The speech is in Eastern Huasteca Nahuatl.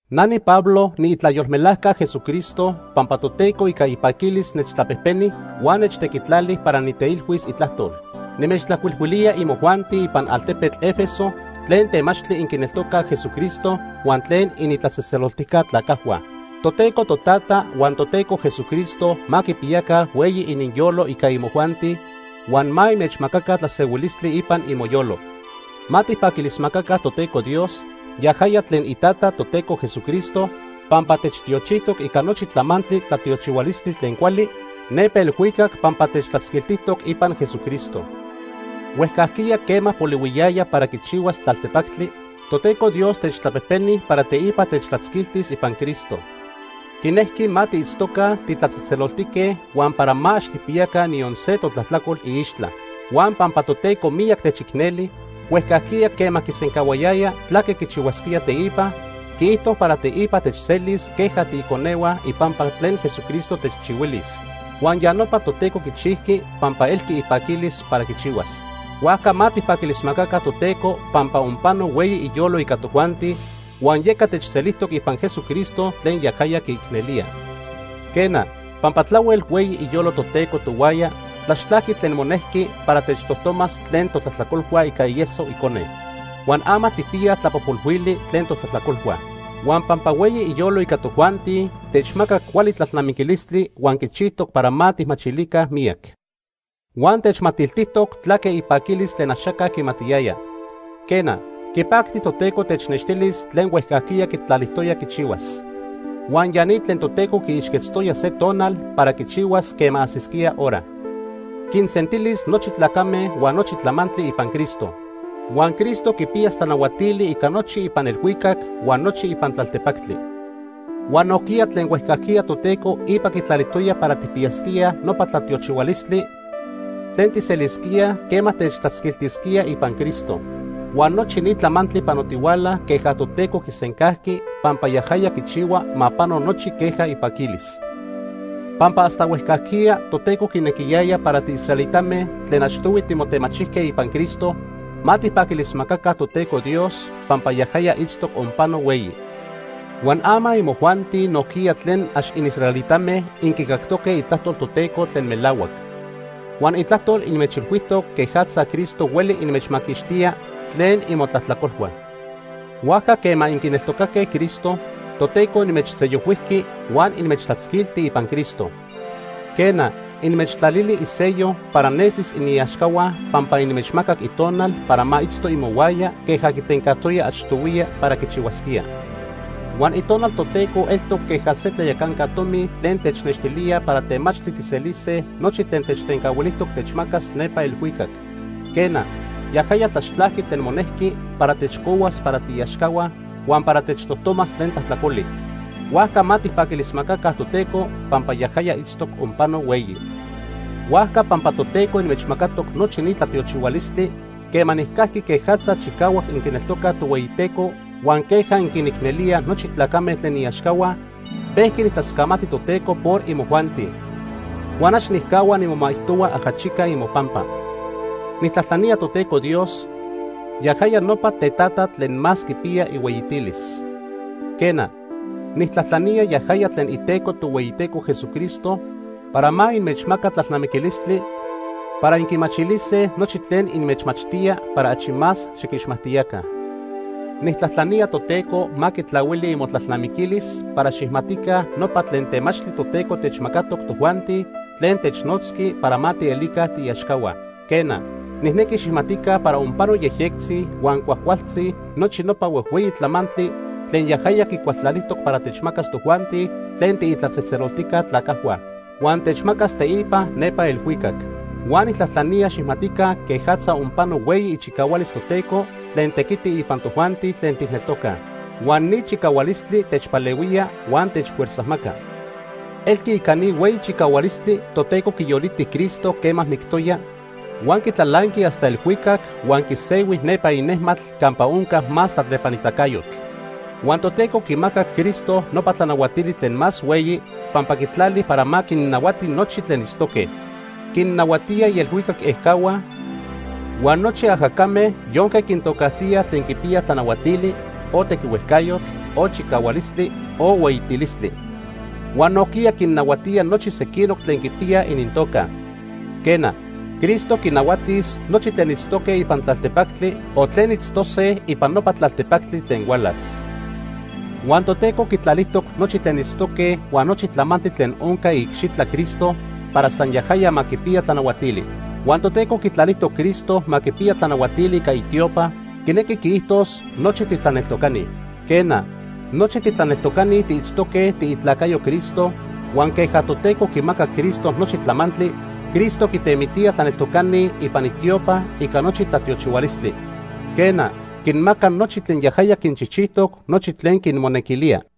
Na niPablo niitlayolmelajca Jesucristo pampa Toteco ica ipaquilis nechtlapejpeni huan nechtequitlali para niteilhuis Itlajtol. Nimechtlajcuilhuilía imojuanti ipan altepetl Éfeso tlen temachtli inquineltocaj Jesucristo huan tlen initlatzejtzeloltijca tlacajhua. Toteco Totata huan Toteco Jesucristo ma quipiyaca hueyi ininyolo ica imojuanti, huan ma inmechmacaca tlasehuilistli ipan imoyolo. Ma tijpaquilismacaca Toteco Dios, yajaya tlen iTata Toteco Jesucristo pampa techtiochijtoc ica nochi tlamantli tlatiochihualistli tlen cuali nepa elhuicac pampa techtlatzquiltijtoc ipan Jesucristo. Huejcajquiya quema polihuiyaya para quichihuas tlaltepactli, Toteco Dios techtlapejpeni para teipa techtlatzquiltis ipan Cristo. Quinejqui ma tiitztoca titlatzejtzeloltique huan para ma ax tijpiyaca niyon se totlajtlacol iixtla. Huan pampa Toteco miyac techicneli, huejcajquiya quema quisencahuayaya tlaque quichihuasquía teipa, quiijto para teipa techselis queja tiiconehua ipampa tlen Jesucristo techchihuilis. Huan ya nopa Toteco quichijqui pampa elqui ipaquilis para quichihuas. Huajca ma tijpaquilismacaca Toteco pampa onpano hueyi iyolo ica tojuanti huan yeca techselijtoc ipan Jesucristo tlen yajaya quiicnelía. Quena, pampa tlahuel hueyi iyolo Toteco tohuaya, tlaxtlajqui tlen monejqui para techtojtomas tlen totlajtlacolhua ica ieso Icone. Huan ama tijpiyaj tlapojpolhuili tlen totlajtlacolhua. Huan pampa hueyi iyolo ica tojuanti techmacac cuali tlalnamiquilistli huan quichijtoc para ma tijmachilica miyac. Huan techmatiltijtoc tlaque ipaquilis tlen axaca quimatiyaya. Quena, quipacti Toteco technextilis tlen huejcajquiya quitlalijtoya quichihuas. Huan ya ni tlen Toteco quiixquetztoya se tonal para quichihuas quema ajsisquía hora. Quinsentilis nochi tlacame huan nochi tlamantli, ipan Cristo. Huan Cristo quipiyas tlanahuatili ica nochi ipan elhuicac huan nochi ipan tlaltepactli. Huan nojquiya tlen huejcajquiya Toteco ipa quitlalijtoya para tijpiyasquíaj nopa tlatiochihualistli tlen tijselisquíaj quema techtlatzquiltisquía ipan Cristo. Huan nochi ni tlamantli panotihuala queja Toteco quisencajqui pampa yajaya quichihua ma pano nochi queja ipaquilis. Pampa hasta huejcajquiya Toteco quinequiyaya para tiisraelitame tlen achtohui timotemachijque ipan Cristo, ma tijpaquilismacaca Toteco Dios pampa yajaya itztoc onpano hueyi. Huan ama imojuanti nojquiya tlen ax inisraelitame inquicactoque Itlajtol Toteco tlen melahuac. Huan Itlajtol inmechilhuijtoc quejatza Cristo hueli inmechmaquixtía tlen imotlajtlacolhua. Huajca quema inquineltocaque Cristo, Toteco inmechsellohuijqui huan inmechtlatzquilti ipan Cristo. Quena, inmechtlalili isello para nesis iniaxcahua pampa inmechmacac Itonal para ma itzto imohuaya queja quitencajtoya achtohuiya para quichihuasquía. Huan Itonal Toteco eltoc queja se tlayacanca tomi tlen technextilía para temachtli tijselise nochi tlen techtencahuilijtoc techmacas nepa elhuicac. Quena, yajaya tlaxtlajqui tlen monejqui para techcohuas para tiiaxcahua huan para techtojtomas tlen tlajtlacoli. Huajca ma tijpaquilismacaca Toteco pampa yajaya itztoc onpano hueyi. Huajca pampa Toteco inmechmacatoc nochi ni tlatiochihualistli, quema nijcajqui quejatza chicahuac inquineltocaj Tohueyiteco huan queja inquinicnelíaj nochi tlacame tlen iaxcahua, pejqui nijtlascamati Toteco por imojuanti. Huan ax nijcahua nimomaijtohua ajachica imopampa. Nijtlajtlanía Toteco Dios, yajaya nopa Tetata tlen más quipiya ihueyitilis. Quena, nijtlajtlanía yajaya tlen Iteco Tohueyiteco Jesucristo para ma inmechmaca tlalnamiquilistli para inquimachilise nochi tlen inmechmachtía para achi más xiquixmajtiyaca. Nijtlajtlanía Toteco ma quitlahuili imotlalnamiquilis para xijmatica nopa tlen temachtli Toteco techmacatoc tojuanti tlen technotzqui para ma tielica tiiaxcahua. Quena, nijnequi xijmatica para onpano yejyectzi huan cuajcualtzi nochi nopa huejhueyi tlamantli tlen yajaya quicualtlalijtoc para techmacas tojuanti tlen tiitlatzejtzeloltijca tlacajhua. Huan techmacas teipa nepa elhuicac. Huan nijtlajtlanía xijmatica quejatza onpano hueyi ichicahualis Toteco tlen tequiti ipan tojuanti tlen tijneltocaj. Huan ni chicahualistli techpalehuía huan techfuerzajmaca. Elqui ica ni hueyi chicahualistli Toteco quiyoliti Cristo quema mictoya, huan quitlalanqui hasta elhuicac huan quisehui nepa inejmatl campa onca más tlatlepanitacayotl. Huan Toteco quimacac Cristo nopa tlanahuatili tlen más hueyi pampa quitlali para ma quinnahuati nochi tlen itztoque. Quinnahuatía ielhuicac ejcahua huan nochi ajacame yonque quintocajtíaj tlen quipiyaj tlanahuatili, o tequiticayotl, o chicahualistli o hueyitilistli. Huan nojquiya quinnahuatía nochi sequinoc tlen quipiyaj inintoca. Quena, Cristo quinahuatis nochi tlen itztoque ipan tlaltepactli o tlen itztose ipan nopa tlaltepactli tlen hualas. Huan Toteco quitlalijtoc nochi tlen itztoque huan nochi tlamantli tlen onca iicxitla Cristo para san yajaya ma quipiya tlanahuatili. Huan Toteco quitlalijtoc Cristo ma quipiya tlanahuatili ica itiopa, quinequi quiijtos nochi titlaneltocani. Quena, nochi titlaneltocani tiitztoque tiitlacayoj Cristo huan queja Toteco quimacac Cristo nochi tlamantli, Cristo quitemitía tlaneltocani ipan itiopa ica nochi tlatiochihualistli. Quena, quinmaca nochi tlen yajaya quinchijchijtoc, nochi tlen quinmonequilía.